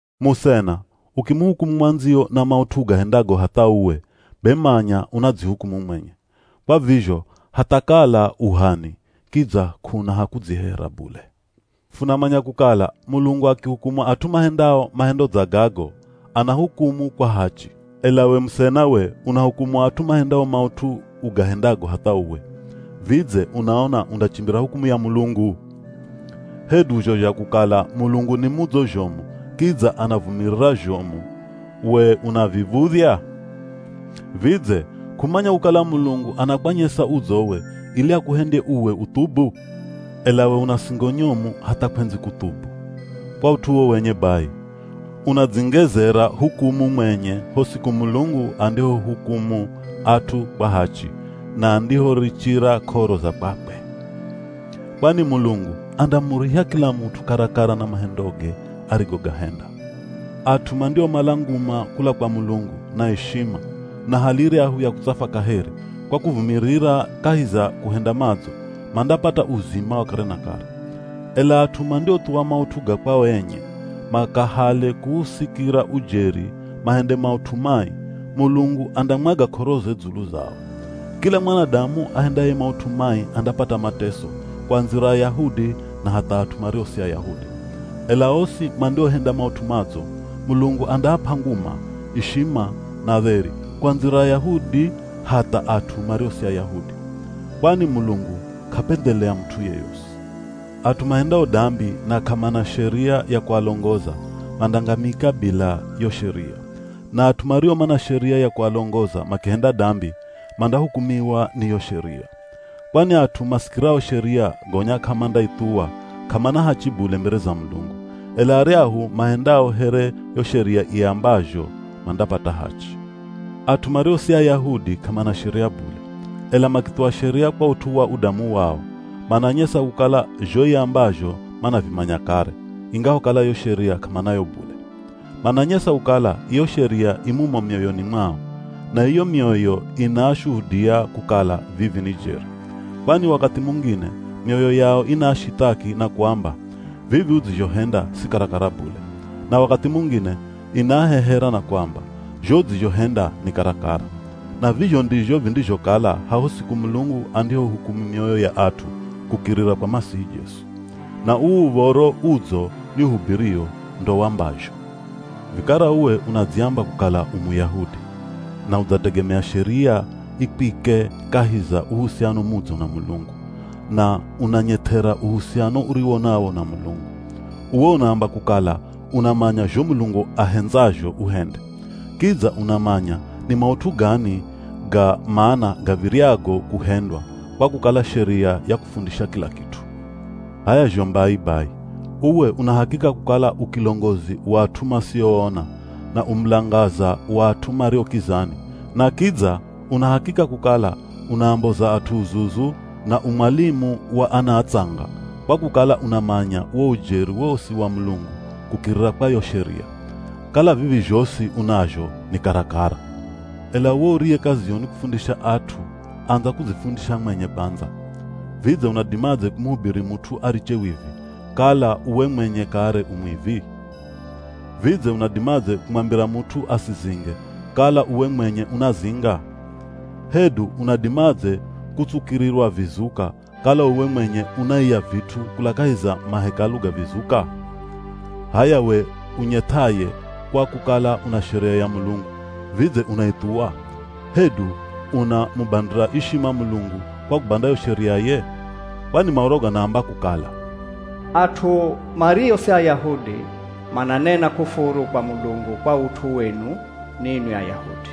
Musena, ukimuhukumu mwandziyo na maut'u ugahendago hatha uwe, be manya unadzihukumu mwenye. Kwa vizho hatha kala u h'ani kidza k'una ha kudzihehera bule. Funamanya kukala Mulungu akihukumu at'u mahendao mahendo dza gago, anahukumu kwa hachi. Ela we musena we unahukumu at'u mahendao maut'u ugahendago hatha uwe. Vidze unaona undachimbira hukumu ya Mulungu? Hedu zho zha kukala Mulungu ni mudzo zhomu kidza anavumirira zhomu we unaviv̱udhya? Vidze k'umanya kukala Mulungu anakwanyesa udzowe ili akuhendye uwe uthubu? Ela we una singo nyomu hatha kw'endzi kuthubu. Kwa ut'u uwo wenye bai, unadzingezera hukumu mwenye ho siku Mulungu andihohukumu at'u kwa hachi, na andihorichira k'oro za kwakwe. Kwani Mulungu andamuriha kila mut'u karakara na mahendoge arigogahenda. At'u mandiomala nguma kula kwa Mulungu, na ishima, na hali iryahu ya kutsafwa kaheri, kwa kuvumirira kahi za kuhenda madzo, mandapata uzima wa kare na kare. Ela at'u mandiothuwa maut'u ga kwao enye, makahale kuusikira ujeri mahende maut'u mai, Mulungu andamwaga k'oroze dzulu zao. Kila mwanadamu ahendaye maut'u mai andapata mateso, kuandzira Ayahudi na hatha at'u mario si Ayahudi. Ela osi mandiohenda maut'u madzo Mulungu andaap'a nguma, ishima, na dheri, kuandzira Ayahudi hatha at'u mario si Ayahudi. Kwani Mulungu k'apendhelea mut'u yoyosi. At'u mahendao dambi na k'amana Sheria ya kualongoza, mandangamika bila yo Sheria. Na at'u mario mana Sheria ya kualongoza makihenda dambi, mandahukumiwa ni yo Sheria. Kwani at'u masikirao Sheria gonya k'amandaithuwa k'amana hachi bule mbere za Mulungu. Ela aryahu mahendao here yo Sheria iambazho mandapata hachi. At'u mario si Ayahudi k'amana Sheria bule. Ela makithuwa Sheria kwa ut'u wa udamu wao, mananyesa kukala zho iambazho manavimanya kare, ingahokala yo Sheria k'amanayo bule. Mananyesa kukala iyo Sheria i mumo mioyoni mwao. Na iyo mioyo inaashuhudia kukala vivi ni jeri. Kwani wakathi mungine mioyo yao inaashithaki na kuamba, “Vivi udzizhohenda si karakara bule.” Na wakathi mungine inaahehera na kuamba, “Zho udzizhohenda ni karakara.” Na vizho ndizho vindizhokala haho siku Mulungu andihohukumu mioyo ya at'u kukirira kwa Masihi Jesu. Na uu Uv̱oro Udzo nihubirio ndo wambazho. Vikara uwe unadziamba kukala u Muyahudi, na udzategemea Sheria ikwike kahi za uhusiano mudzo na Mulungu, na unanyeth'era uhusiano uriwo nawo na Mulungu. Uwe unaamba kukala unamanya zho Mulungu ahendzazho uhende. Kidza unamanya ni maut'u gani ga mana gav̱iryago kuhendwa, kwa kukala Sheria yakufundisha kila kit'u. H'aya zho mbai bai, uwe una hakika kukala u kilongozi wa at'u masioona, na u mulangaza wa at'u mario kizani, na kidza una hakika kukala unaamboza at'u uzuzu na u mwalimu wa ana atsanga, kwa kukala unamanya wo ujeri wosi wa Mulungu kukirira kwa yo Sheria. Kala vivi zhosi unazho ni karakara. Ela uwe uriye kaziyo ni kufundisha at'u andza kudzifundisha mwenye kwandza. Vidze unadimadze kumuhubiri mut'u ariche wivi, kala uwe mwenye kare u mwivi? Vidze unadimadze kumwambira mut'u asizinge kala uwe mwenye unazinga? Hedu unadimadze kutsukirirwa vizuka kala uwe mwenye unaiya vit'u kula kahi za mahekalu ga vizuka? H'aya we unyeth'aye kwa kukala una Sheria ya Mulungu, vidze unaithuwa, hedu unamubandira ishima Mulungu kwa kubanda yo Sheriaye? Kwani Maoro ganaamba kukala, “At'u mario si Ayahudi mananena kufuru kwa Mulungu kwa ut'u wenu ninwi Ayahudi.”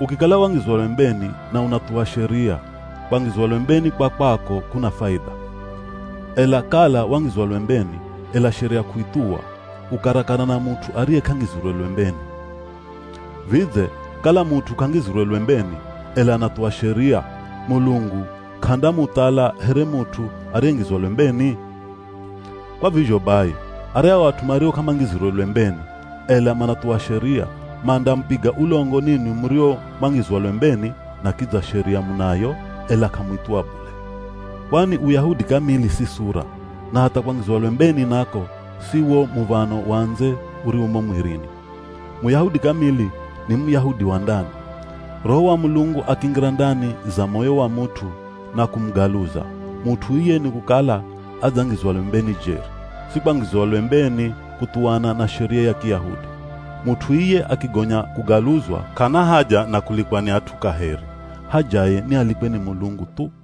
Ukikala wangizwa lwembeni na unathuwa Sheria, kwangizwa lwembeni kwa kwako kuna faidha. Ela kala wangizwa lwembeni, ela Sheria k'uithuwa, u karakara na mut'u ariye k'angizirwe lwembeni. Vidze kala mut'u k'angizirwe lwembeni, ela anathuwa Sheria, Mulungu k'andamuthala here mut'u ariyengizwa lwembeni? Kwa vizho bai, aryahu at'u mario k'amangizirwe lwembeni, ela manathuwa Sheria, mandamupiga ulongo ninwi murio mwangizwa lwembeni na kidza Sheria munayo, ela k'amuithuwa bule. Kwani Uyahudi kamili si sura, na hatha kwangizwa lwembeni nako si wo muv̱ano wa ndze uriwo mo mwirini. Muyahudi kamili ni Muyahudi wa ndani. Roho wa Mulungu akingira ndani za moyo wa mut'u na kumugaluza, mut'u iye nikukala adzangizwa lwembeni jeri, si kwangizwa lwembeni kuthuwana na Sheria ya Kiyahudi. Mut'u iye akigonya kugaluzwa k'ana haja na kulikwa ni at'u kaheri, hajaye ni alikwe ni Mulungu thu.